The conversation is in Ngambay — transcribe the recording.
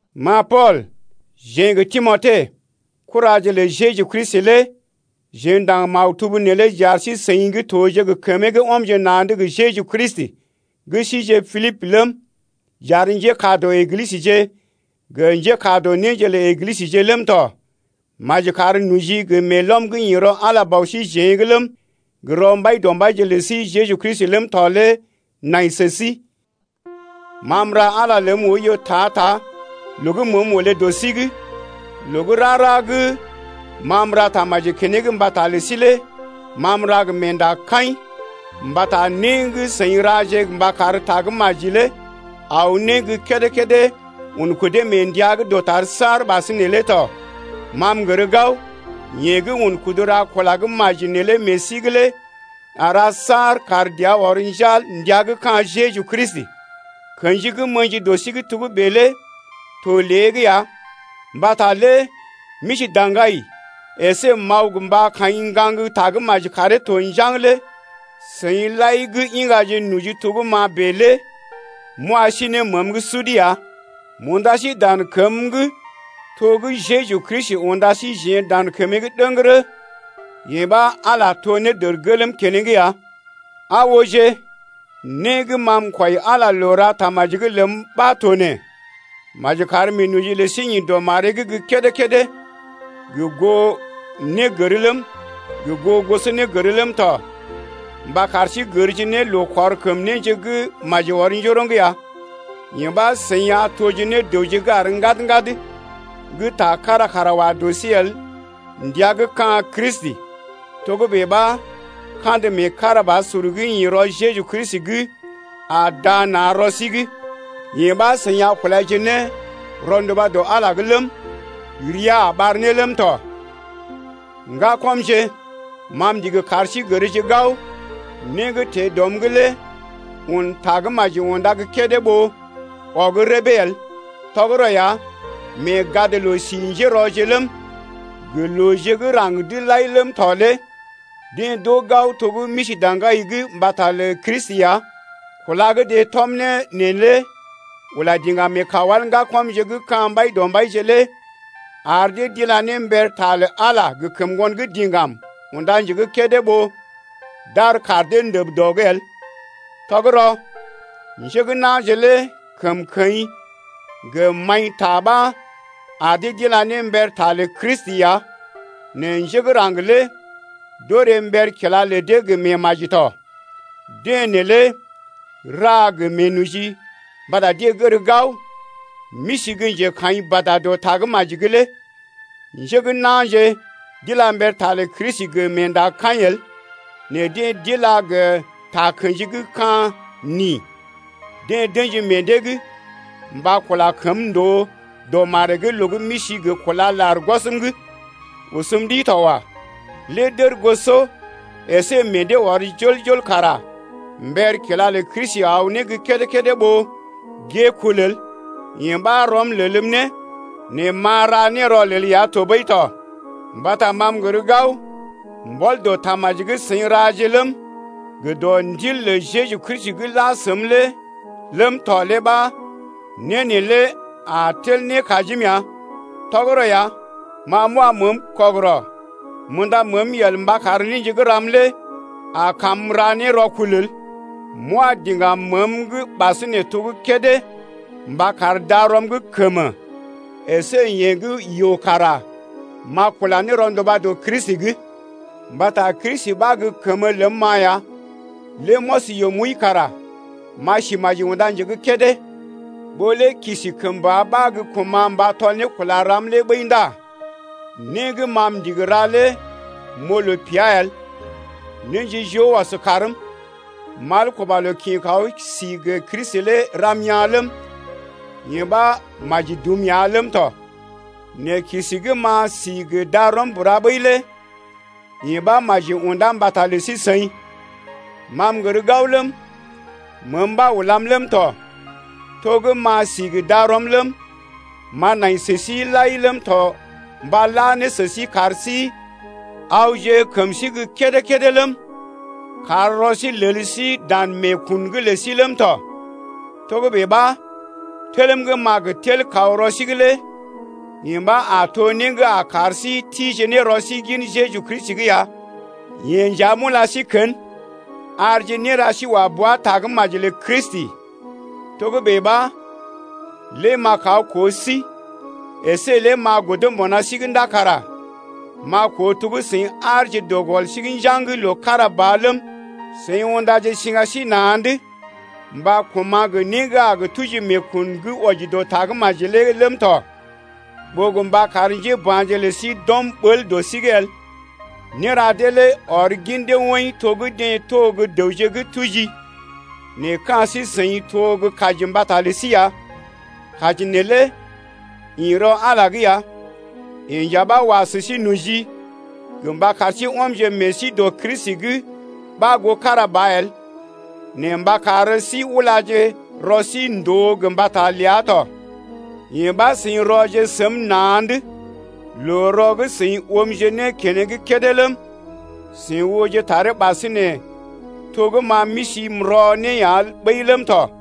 Ma Pool, jeḛ gə́ Timote, kuraje lə Jeju Kristi lé jeḛ ndaŋg maktub neelé j’ar sí-seḭ gə́ toje gə kəmee gə́ ɔmje na̰’d gə Jeju Kristi gə́ sije Pilibə ləm, j’ar njékaa dɔ Eglisəje gə njékaa dɔ néje lə Eglisəje ləm tɔ. Maji kar noji gə meelɔm gə́ ḭ rɔ Ala Bɔ síjeḛ’g ləm, gə rɔ Mbaidɔmbaije’g lə sí Jeju Kristi ləm tɔ lé nai sə sí. Ma m’ra Ala ləm oiyo ta-ta loo gə́ məəm olé dɔ sí’g, loo gə́ rara gə́ ma m’ra tamaji keneŋ mbata lə sí lé ma m’ra gə meendakaḭ, mbata né gə́ seḭ raje mba kar Tagə́maji lé aw ne gə́ kédé-kédé un kudee mee ndəa gə́ dɔtar’g saar ɓasinè lé tɔ. Ma m’gər gao yeḛ gə́ un kudu ra kula gə́ maji neelé meḛ sí’g lé a ra saar kar dəa ɔr njal ndəa gə́ ka̰ Jeju Kristi ya. Kḛji gə́ m’ə̰ji dɔ sí’g togə́bè lé to lée’g ya mbata lé m’isi daŋgai’g əsé m’aw mba kaḭ ŋgaŋ Tagə́maji karee to njaŋg lé seḭ lai gə́ iŋgaje noji to gə́ ma bèe lé m’wa sí ne məəm’g sud ya. M’unda sí dan kəm’g to gə́ Jeju Kristi unda síjeḛ dan kəmee’g ɗəŋgərə, yee ɓa, Ala to ne dərgelm keneŋ ya. Aa ooje, né gə́ ma m’kwɔi Ala loo ra tamaji’g ləm ɓa to nee: Maji kar meenoji lə sí ḭ dɔ maree’g gə́ kédé-kédé gə goo négər ləm, gə goo gosonégər ləm tɔ mba kar sí gərje ne loo kɔr kəm néje gə́ maji ɔr njoroŋ ya. Yee ɓa seḭ a toje ne dəwje gə́ àr ŋgad-ŋgad gə́ ta kára kara wa dɔ sí el ndəa gə́ ka̰ Kristi lé. Togə́bè ɓa, kandə meekarabasur gə́ ḭ rɔ Jeju Kristi’g a daa na̰ rɔ sí’g, yee ɓa seḭ a kulaje ne rɔnduba dɔ Ala’g ləm, ria a ɓar ne ləm tɔ. Ŋgakɔmje, ma m’ndigi kar sí gərje gao, né gə́ teḛ dɔm’g lé un Tagə́maji unda gə́ kédé ɓó ɔg rəbee el. Tɔgərɔ ya, mee gadloo-si njérɔje ləm, gə looje gə́ raŋg’d lai ləm tɔ lé deḛ d’oo gao to gə́ m’isi daŋgai’g mbata lə Kristi ya. Kúla gə́ deḛ tɔm ne neelé ula diŋgam meḛ kawal ŋgakɔmje gə́ ka̰ Mbaidɔmbaije lé ar dee d’ila ne mber ta lə Ala gə kəm ŋgon diŋgam unda nje gə́ kédé ɓó d’ar kaar dee ndəb dɔ’g el. Tɔgərɔ, njé gə́ na̰je lé kəmkəḭ gə maḭta ɓa ar dee d’ila ne mber ta lə Kristi ya nɛ njé gə́ raŋg lé d’orè mber kila lə dee gə meemaji tɔ. Deḛ neelé ra gə meenoji mbata deḛ gər gao m’isi gə́ njekaḭ bada dɔ Tagə́maji’g lé. Njé gə́ na̰je d’ila mber ta lə Kristi gə meendakaḭ el nɛ deḛ d’ila gə takə̰ji gə́ ka̰ nin, deḛ d’ə̰ji meḛ dee’g mba kula kəm ndòo dɔ maree’g loo gə́ m’isi gə kúla lar gwɔsm’g. Osəm ɗi to wa! Lé d’ərgosɔ əsé meḛ dee ɔr jol-jol kara mber kila lə Kristi aw gə́ kédé-kédé ɓó gée kul el, yee ɓa, rɔm lelm ne, nɛ m’a ra ne rɔlel ya tɔɓəi tɔ. Mbata ma m’gər gao mbɔl dɔ tamaji gə́ seḭ raje ləm, gə dɔ Ndil lə Jeju Kristi gə́ la səm lé ləm tɔ lé ɓa né neelé a tel ne kajim ya. Tɔgərɔ ya ma m’wa məəm kɔgərɔ m’unda məəm yel mba kar néje gə́ ram lé a kam m’ra ne rɔkul el. M’wa diŋgam məəm’g ɓasinè to gə́ kédé mba kar darɔm gə́ kəm əsé yeḛ gə́ yoo kara m’a kula ne rɔnduba dɔ Kristi’g. Mbata Kristi ɓa gə́ kəmə ləm-ma ya, lé m’ɔs yoo m’wəi kara m’a si maji unda nje gə́ kédé. Ɓó lé kisi kəmba ɓa gə kuma̰ mba tɔl ne kula ram lé ɓəi ndá né gə́ ma m’ndigi ra lé m’oo loo pea el. Néje joo ɔs kaarm: mal kuba loo kḭ kaw si gə Kristi lé ram yaa̰ ləm, yee ɓa, maji dum ya ləm tɔ. Nɛ kisi gə́ m’a si gə darɔm bura ɓəi lé yee ɓa maji unda mbata lə sí-seḭ. Ma m’gər gao ləm, məəm ɓa ulam ləm tɔ, to gə́ m’a si gə darɔm ləm, m’a nai sə sí lai ləm tɔ mba la ne sə sí kar sí awje kəm sí gə́ kédé-kédé ləm, kar rɔ sí lel sí dan meekun’g lə sí ləm tɔ. Togə́bè ɓa, telm gə́ m’a gə tel kaw rɔ sí’g lé yee ɓa a to né gə́ a kar sí tije ne rɔ sí gin Jeju Kristi’g ya. Yee nja m’ula sí kən, arje néra sí wa bua Tagə́maji lə Kristi, togə́bè ɓa, lé m’a kaw koo sí əsé lé m’a godo mbuna sí’g ndá kara m’a koo to gə́ seḭ aarje dɔ gɔl sí’g njaŋg loo kára ba ləm, seḭ undaje siŋga sí na̰’d mba koma̰ gə né gə́ a tuji meekun gə́ wɔji dɔ Tagə́maji lé ləm tɔ, ɓó gə mba kar njéba̰je lə sí d’ɔm ɓəl dɔ sí’g el. Néra dee lé ɔr gin dee woḭ to gə́ deḛ to gə́ dəwje gə́ tuji nɛ ka̰ sí-seḭ to gə́ kaji mbata lə sí ya. Kaji neelé ḭ rɔ Ala’g ya, yeḛ nja ɓa wa sə sí noji gə mba kar sí ɔmje meḛ sí dɔ Kristi’g ɓa goo kára ba el, nɛ mba kar sí ulaje rɔ sí ndòo gə mbata ləa tɔ. Yee ɓa seḭje rɔje səm na̰’d loo-rɔ gə́ seḭ oomje ne keneŋ kédé ləm, seḭ ooje taree ɓasinè to gə́ ma m’isi m’rɔ ne ya ɓəi ləm tɔ.